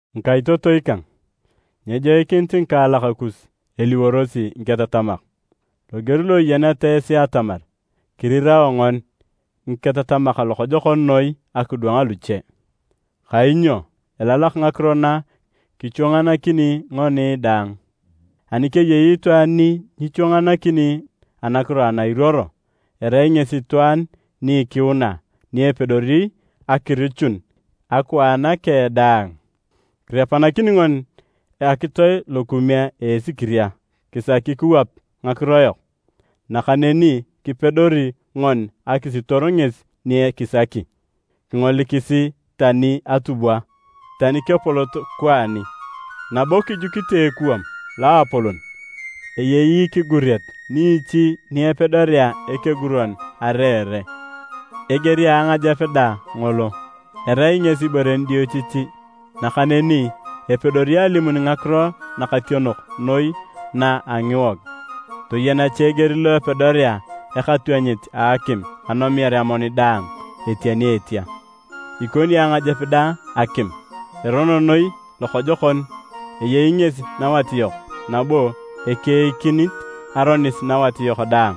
Ngikaitotoi kang, nyejoikinit ngikaalak kus eliworosi ngiketatamak. Loger lo iyeneta esi atamar kirirao ngoni ngiketatamak lokojokon noi akidwang luche. Kainyo elalak ngakiro na kichwanganakini ngoni daang. Ani keyei itwaan ni nyichwanganakini anakiro ana iruoro, erai ngesi itwaan ni ikiuna ni epedori akirichun akwaan keng daang. Kirepanakini ngoni akitoe lokume a asikiria kisaki kiwap ngakiro yok, nakaneni kipedori ngoni akisiitor ngesi ni kisaki. Kingolikisi tani atubwa, tani kepolot kwaani, nabo kijukite ekuwam loapolon, eyei ikiguriet niichi ni epedorea ekeguron areere. Eger a angajep dang ngolo, erai ngesi ibore nidiochichi, nakaneni epedori alimun ngakiro nakationok noi na a ngiwog. Toyen cha eger lo epedorea ekatwanyit a akim anomiar amoni daang etia ni etia! Ikoni angajep dang akim. Erono noi lokojokon, eyei ngesi nawat yok nabo ekeikinit aronis nawat yok daang.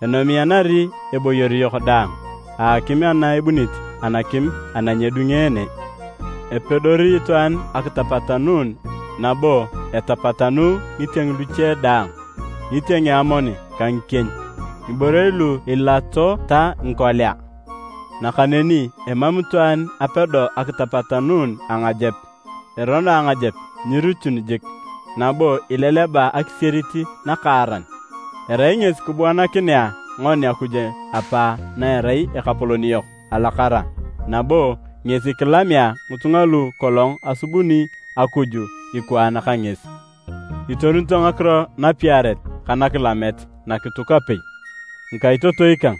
Enomianari eboyor yok daang a akim ana ebunit anakim ana nyedungeene. Epedori itwaan akitapatanuun nabo etapatanu ngitieng luche daang, ngitieng a amoni ka ngikieny, ngiborei lu eliato ta ngikolea. Nakaneni emam itwaan apedo akitapatanuun angajep. Erono angajep nyirichun jik, nabo ileleba akisierit nakaaran. Erai ngesi kibuanakinea ngoni Akuj Apa na erai Ekapolon yok alakara nabo ngesi kilamea ngitunga lu kolong asubuni Akuj ikwaan ka ngesi. Itorunito ngakiro napiaret ka nakilamet nakituk apei. Ngikaitotoi kang,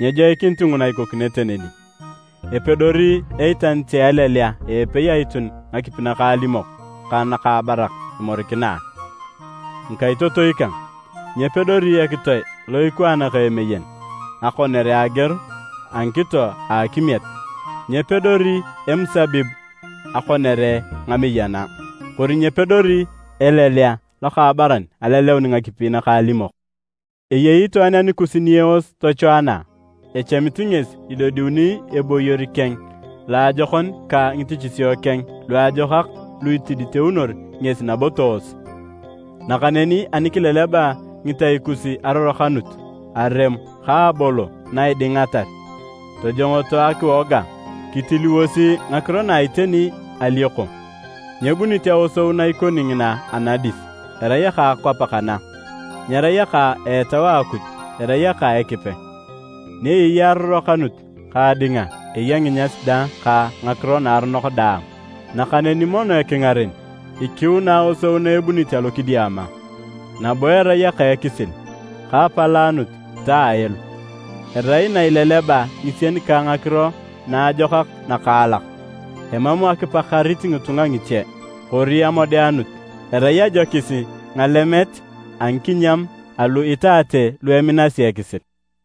nyejoikinit nguna ikokinete neni! Epedori eitanit a elelea a epei aitun ngakipi nakaalimok ka nakaabarak imorikina a? Ngikaitotoi kang! Nyepedori ekitoe lo ikwaan ka emeyen akonere ageor a ngikito a akimiet, nyepedori emusabib akonere ngameyana, kori nyepedori elelea lokaabaran aleleun ngakipi nakaalimok. Eyei itwaan anikus ni eos tochwaana a? Echamit ngesi idodiuni a eboyor keng a loajokon ka ngitichisio keng luajokak lu itiditeunor ngesi nabo toos. Nakaneni ani kileleba ngitai kus arorokanut, aremo ka abolo na idingatar, tojongoto akiwoga kitiliwosi ngakiro na iteni alioko. Nyebunit aosou na ikoni ngina anadis, erai aka akwap kana, nyerai aka a Etau a Akuj, erai aka a Ekipe. Ni eyei arorokanut ka adinga, eya nginyas dang ka ngakiro naaronok daang. Nakaneni mono ekingaren, ikiuna aosou na ebunit alokidiama, nabo erai aka ekisil ka apalaanut ta aelo. Erai na ileleba ngisien ka ngakiro naajokak nakaalak, emam akipakarit ngitunga ngiche, kori amodeanut. Erai ajokis ngalemet a ngikinyam alu itaate lu eminasi ekisil.